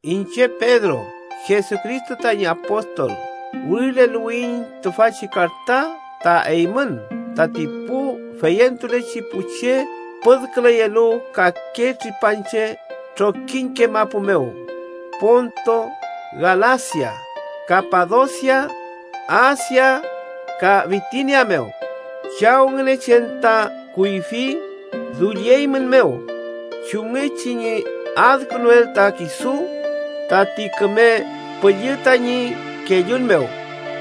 Iñche Pedro, Jesucristo tañi apostol, wirileluwiyiñ tüfachi karta ta eymün tati pu feyentulechi pu che püdküleyelu kake tripanche trokiñke mapu mew: Ponto, Galasia, Kapadosia, Asia ka Bitinia mew. Chaw Ngünechen ta kuyfi dullieymünmew chumngechi ñi adkünuel ta kisu. Tati Küme Püllü tañi kellun mew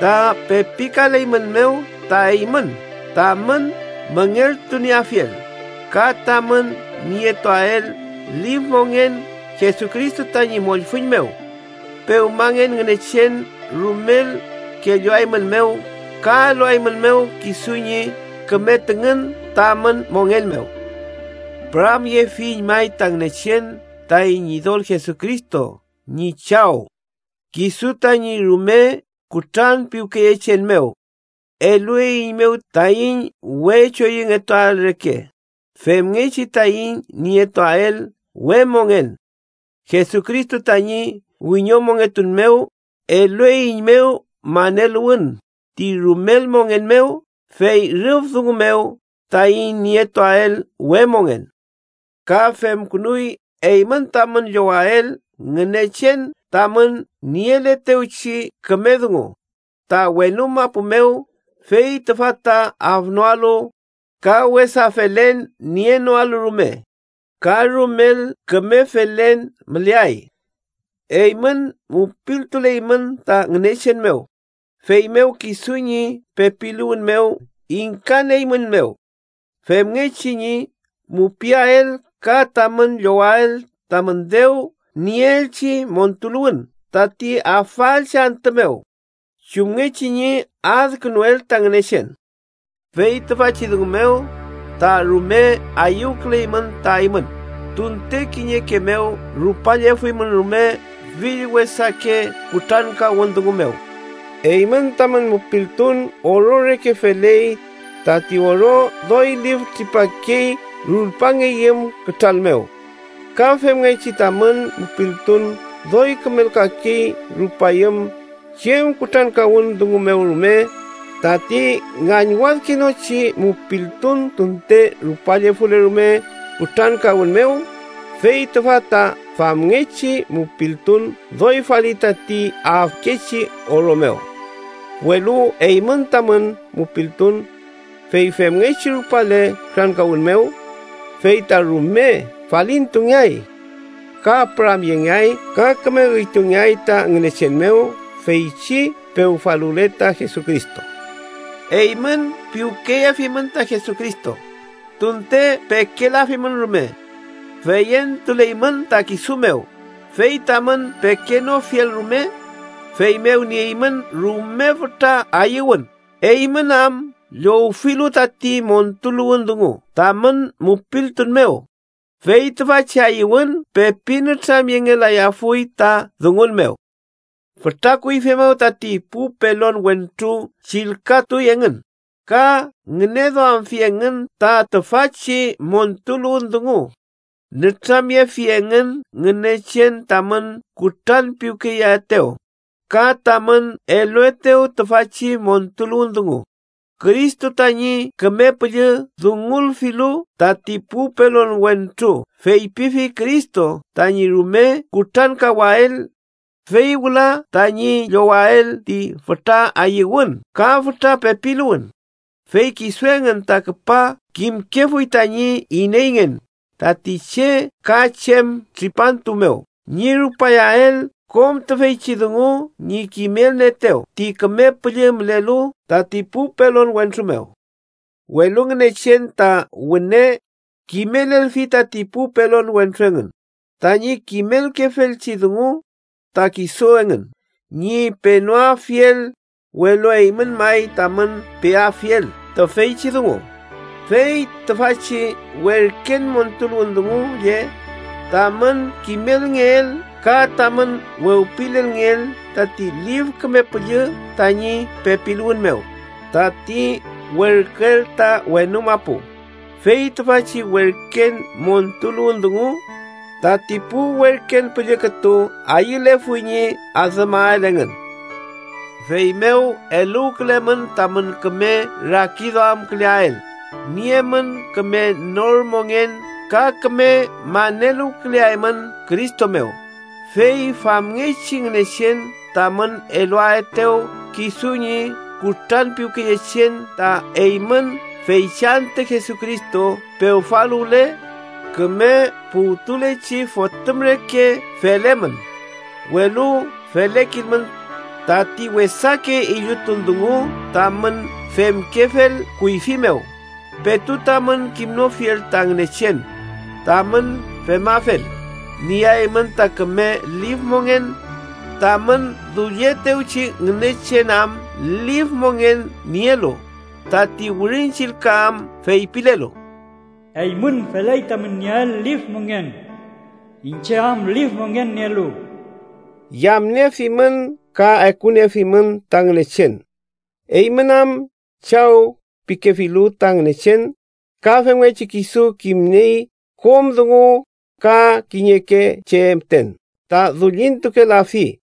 ta pepikaleymünmew ta eymün tamün müngeltunieafiel ka tamün nietuael lif mongen Jesucristo tañi mollfüñ mew. Pewmangen Ngünechen rumel kelluaeymünmew ka eluaeymünmew kisu ñi küme tüngün tamün mongen mew. Püramyefiyiñ may ta Ngünechen, taiñ Ñidol Jesucristo ñi Chaw. Kisu tañi rume kutranpiwkeyechen mew elueiñmew taiñ we choyüngetuael reke femngechi taiñ nietuael we mongen. Jesucristo tañi wiñomongetun mew elueiñmew maneluwün ti rumel mongen mew, fey rüf dungu mew taiñ nietuael we mongen. Ka femkünuy eymün tamün llowael Ngünechen tamün nieletewchi küme dungu ta wenu mapu mew, fey tüfa ta afnoalu, ka wesa felen nienoalu rume, ka rumel küme felen müleay. Eymün mupiltuleymün ta Ngünechen mew, feymew kisu ñi pepiluwün mew ingkanieeymünmew femngechi ñi mupiael ka tamün llowael tamün dew nieelchi montuluwün tati afaelchi antü mew chumngechi ñi adkünuel ta Ngünechen. Fey tüfachi dungu mew ta rume ayüwküleymün ta eymün, tunte kiñeke mew rupallefuymün rume fill wesake kutrankawün dungu mew. Eymün tamün mupiltun oro reke feley. Tati oro doy lif tripakey rulpangeyüm kütral mew, ka femngechi tamün mupiltun doy kümelkakey rupayüm chem kutrankawün dungu mew rume. Tati ngañwadkenochi mupiltun tunte rupallefule rume kutrankawün mew, fey tüfa ta famngechi mupiltun doy faliy tati afkechi oro mew. Welu eymün tamün mupiltun, fey femngechi rupale kutrankawün mew, fey ta rume falintungeay, ka püramyengeay ka küme üytungeay ta Ngünechen mew feychi pewfaluwle ta Jesucristo. Eymün piwkeyefimün ta Jesucristo, tunte pekelafimün rume. Feyentuleymün ta kisu mew fey tamün pekenofiel rume. Feymew nieymün rume fütra ayüwün, eymün am llowfilu tati montuluwün dungu tamün mupiltun mew, fey tüfachi ayüwün pepi nütramyengelayafuy ta dungun mew. Fütra kuyfi mew tati pu pelon wentru chillkatuy engün ka ngüneduamfi engün ta tüfachi montuluwün dungu. Nütramyefi engün Ngünechen tamün kutranpiwkeyeaetew ka tamün eluetew tüfachi montuluwün dungu. Cristo tañi Küme Püllü dungulfilu tati pu pelon wentru feypifi Cristo tañi rume kutrankawael, fey wüla tañi llowael ti fütra ayüwün ka fütra pepiluwün. Fey kisu engün ta küpa kimkefuy tañi ineyngen tati che ka chem tripantu mew ñi rupayael kom tüfeychi dungu ñi kimelnieetew ti Küme Püllü mülelu tati pu pelon wentru mew. Welu Ngünechen ta wüne kimelelfi tati pu pelon wentru engün tañi kimelkefelchi dungu ta kisu engün ñi penoafiel, welu eymün may tamün peafiel tüfeychi dungu. Fey tüfachi werken montuluwün dungu lle tamün kimelngeel ka tamün wewpilelngeel tati Lif Küme Püllü tañi pepiluwün mew, tati werküel ta wenu mapu. ¡Fey tüfachi werken montuluwün dungu tati pu werken püllü kütu ayülefuy ñi adümael engün! Feymew eluwkülemün tamün küme rakiduamküleael. Niemün küme nor mongen ka küme maneluwküleaymün Cristo mew, fey famngechi Ngünechen tamün eluaetew kisu ñi kutranpiwkeyechen ta eymün feychi antü Jesucristo pewfaluwle. Küme puwtulechi fotüm reke felemün, welu felekilmün tati wesake illutun dungu tamün femkefel kuyfi mew, petu tamün kimnofiel ta Ngünechen. Tamün femafel, nieaymün ta küme lif mongen, tamün dullietewchi Ngünechen am lif mongen nielu, tati Wirin Chillka am feypilelu: “Eymün feley tamün nieael lif mongen, iñche am lif mongen nielu.” Yamniefimün ka ekuniefimün ta Ngünechen, eymün am “Chaw” pikefilu ta Ngünechen, ka femngechi kisu kimniey kom dungu ka kiñeke che müten ta dullintukelafi.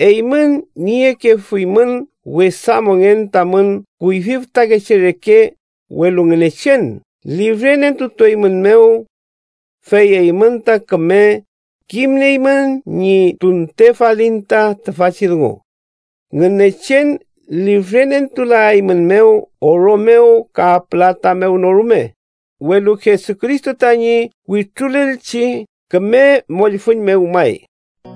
Eymün niekefuymün wesa mongen tamün kuyfi fütakeche reke, welu Ngünechen lifrenentutueymünmew. Fey eymün ta küme kimnieymün ñi tunte falin ta tüfachi dungu. Ngünechen lifrenentulaeymünmew oro mew kam pülata mew no rume, welu Jesucristo tañi wütrulelchi küme mollfüñ mew may,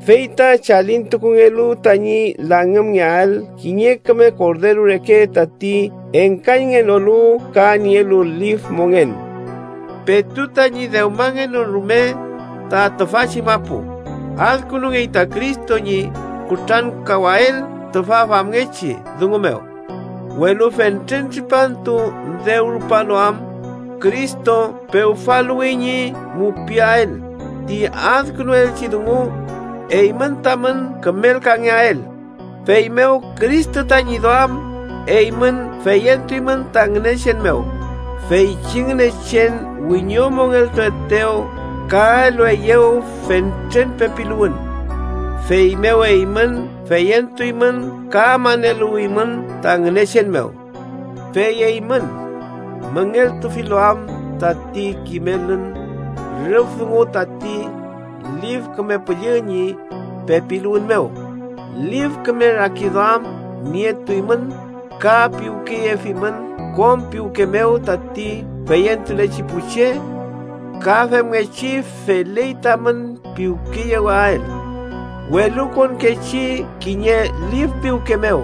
fey ta chalintukungelu tañi langümael kiñe küme korderu reke tati engkañngenolu ka nielu lif mongen. Petu tañi dewmangenon rume ta tüfachi mapu, adkünungey ta Cristo ñi kutrankawael tüfa famngechi dungu mew, welu fentren tripantu dew rupalu am, Cristo pewfaluwi ñi mupiael ti adkünuelchi dungu eymün tamün kümelkangeael. Feymew Cristo tañi duam, eymün feyentuymün ta Ngünechen mew, feychi Ngünechen wiñomongeltuetew ka elueyew fentren pepiluwün. Feymew eymün feyentuymün ka maneluwimün ta Ngünechen mew. Fey eymün, müngeltufilu am tati kimelün rüf dungu tati Lif Küme Püllü ñi pepiluwün mew, lif küme rakiduam nietuymün ka piwkeyefimün kom piwke mew tati feyentulechi pu che. Ka femngechi feley tamün piwkeyewael welukonkechi kiñe lif piwke mew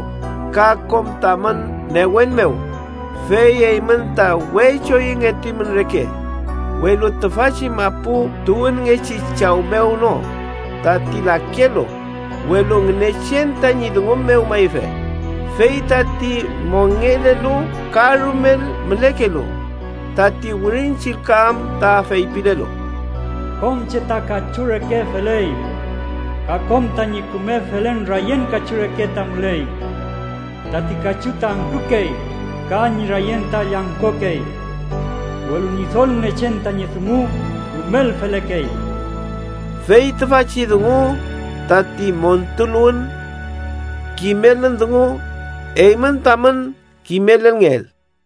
ka kom tamün newen mew. Fey eymün ta we choyüngetuymün reke, welu tüfachi mapu tuwünngechi chaw mew no, tati lakelu, welu Ngünechen tañi dungu mew mayfe, fey tati mongelelu ka rumel mülekelu. Tati Wirin Chillka am ta feypilelu: “Kom che ta kachu reke feley, ka kom tañi küme felen rayen kachu reke ta müley. Tati kachu ta angkükey ka ñi rayen ta llangkokey, welu Ñidol Ngünechen tañi dungu rumel felekey.” Fey tüfachi dungu tati montuluwün kimelün dungu, eymün tamün kimelelngeel.